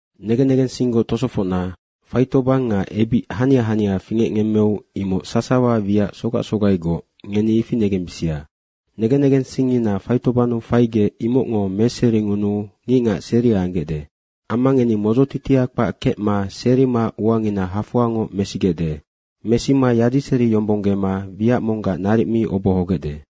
Negen negensinggoc tosofocna, faitobang nga ebic hania hania fingecngemmeu imoc sasawa wiac sogac sogaigoc, ngeni ifi negembisia. Negen negensingngina faitobannu faigec imocngo meseringunuu ngicngac seria anggecde. Amma ngeni modzotitia kpac kecma serima uangina hafoangoc mesigecde. Mesima yadiseriyombonggema wiac monggac naric mi obohogecde.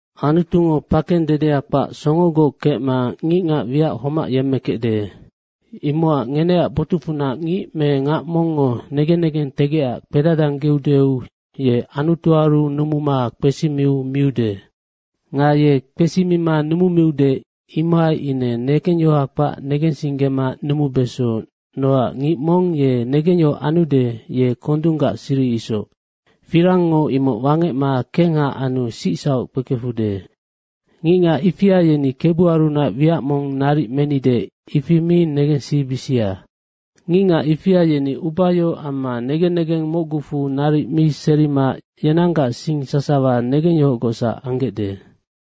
Anutungo pakeng dedea kpac songogoc kecma ngicngac wiac homac yemmekecde. Imocac ngeneac botucfunac ngic me ngac mongngo negen negentegecac kpedadanggeudeu ye Anutuaru numuma kpesimiu miude. Nga ye kpesima numumiude, imohai ine negengyohoha kpac negensinggema numubeso, nocac ngic mong ye negengyohoc anude, ye kondunggac siri isoc, firangngo imoc wangecma kengha anu sicsauc kpekefude. Ngicngac ifia yeni, “Kebuarunac wiac mong naric menide,” imoc mi negensibisia. Ngicngac ifia yeni ubayohoc amma negen negeng mocgucfu naric mi serima yenanggac sing sasawa negengyohocgocsac anggecde.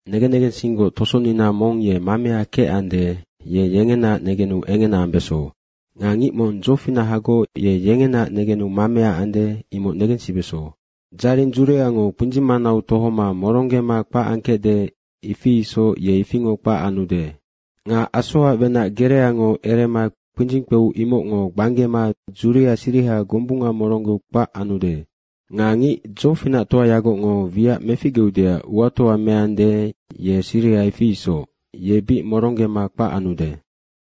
Negen negensinggoc tosonina mong ye mamea kecande, ye yengenaac negenu engena ambeso. Nga ngic mong dzofinahagoc, ye yengenaac negenu mamea ande, imoc negensibeso. Dzaring dzuriango kpindzing manau tohoma moronggema kpac angkecde, ifi isoc ye ifingoc kpac anude. Nga asoac wenac gereango erema kpindzing kpeu imocngo gbanggema dzuria siriha gombunga moronggeu kpac anude. Nga ngic dzofinactoayagocngo wiac meficgeudeac uatoa meande, ye siriha ifi isoc bic moronggema kpac anude.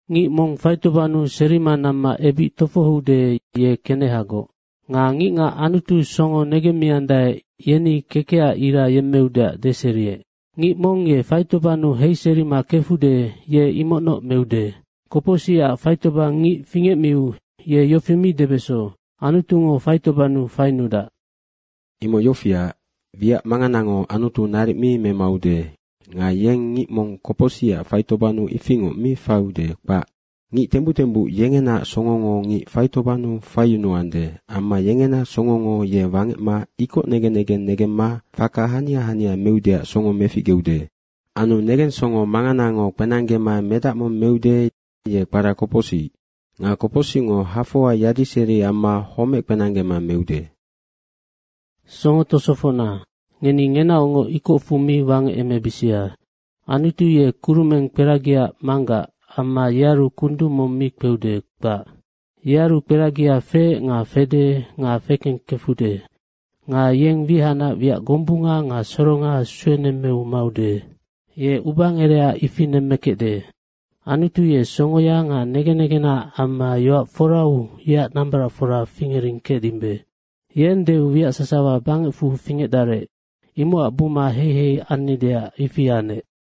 Ngic mong faitobannu serima namma ebic tofohoude, ye kenehagoc. Nga ngicngac Anutu songo negemmiandae, yeni kekecac ira yemmeudeac deseriec. Ngic mong ye faitobannu heiserima kefude, ye imocnoc meude. Kopocsicac faitobang ngic fingecmiu ye yofi mi debeso, “Anutungo faitobannu fainudac.” Imoc yofiac, wiac manganango Anutu naric mi memaude nga yeng ngic mong kopocsicac faitobannu ifingoc mi faiude, kpac. Ngic tembuc tembuc yengenaac songongo ngic faitobannu faiyunuande amma yengena songongo ye wangecma ikoc negen negeng negemma faka hania hania meudeac songo meficgeude. Anu negensongo manganango kpenanggema medac mong meude, ye kpara kopocsic. Nga kopocsicngo hafoa yadiseri amma homec kpenanggema meude. Songo tosofocna, ngeni ngenaocngoc ikocfu mi wangecemebisia. Anutu ye kurumeng kperagiac manggac amma yearu kundung mong mi kpeude, kpac. Yearu kperagia feec nga fede nga fekengkefude. Nga yeng wihacnac wiac gombunga nga soronga suenemmeu maude. Ye ubangereha ifi nemmekecde. Anutu ye songoya nga negen negenaac amma yoac forau yeac nambaracfora fingering kecdimbe. Yeng deu wiac sasawa bangecfu fingecdarec, imocac buma heihei annideac ifi anec.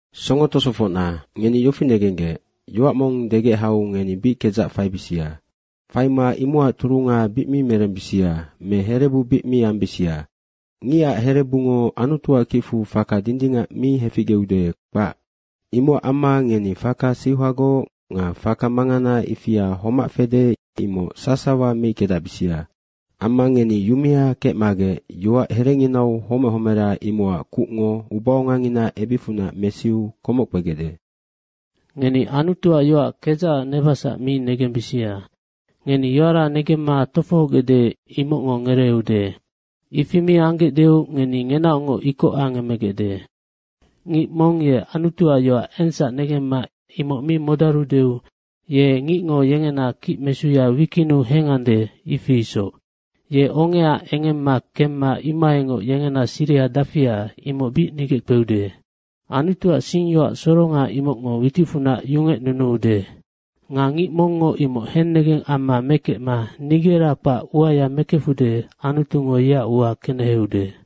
Songo tosofocna, ngeni yofi negenggec, yoac mong degec hau ngeni bic kedzac faibisia. Faima imocac turunga bic mi merembisia me herebu bic mi ambisia. Ngicac herebungo Anutuac kicfu faka dindingac mi heficgeude, kpac. Imocac amma ngeni faka seuhagoc nga faka mangana ifia homac fede, imoc sasawa meickedacbisia. Amma ngeni yumea kecmagec yoac herenginau homec homera, imocac kucngo ubaongangina ebicfunac mesiu komoc kpegecde. Ngeni Anutuac yoac kedzacac nebasac mi negembisia. Ngeni yoara negemma tofohogecde, imocngo ngereeude. Ifi mi anggecdeu ngeni ngenaocngoc ikoc angemegecde. Ngic mong ye Anutuac yoac engsac negemma imoc mi modarudeu ye ngicngo yengena kicmesuya wikinnu hengande, ifi isoc. Ye ongea engemma kemma imohaingoc yengena siriha dafia, imoc bic nigeckpeude. Anutuac singyoac soronga, imocngo witicfunac yungecnunuude. Nga ngic mongngo imoc hennegeng amma mekecma nigera kpac uaya mekefude, Anutungo yeac ua keneheude.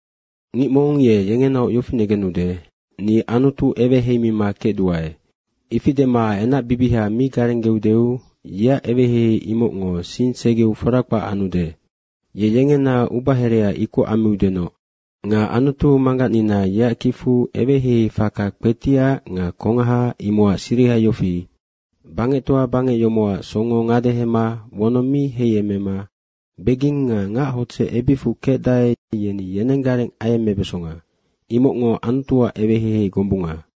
Ngic mong ye yengenaoc yofi negenude, “Ni Anutu eweheimima kecduae,” ifi dema enacbibiha mi garenggeudeu yeac eweheihei imocngo sing segeu fora kpac anude. Ye yengena ubaherea ikoc ammiudenoc. Nga Anutu Manggacnina yeac kicfu eweheihei faka kpetiac nga kongaha, imocac siriha yofi, bangectoa bangec yomocac songo ngadehema wonong mi heiemema beging nga ngachodzec ebicfu kecdae, yeni yenenggareng ayemmebesonga. Imocngo Anutuac eweheihei gombunga.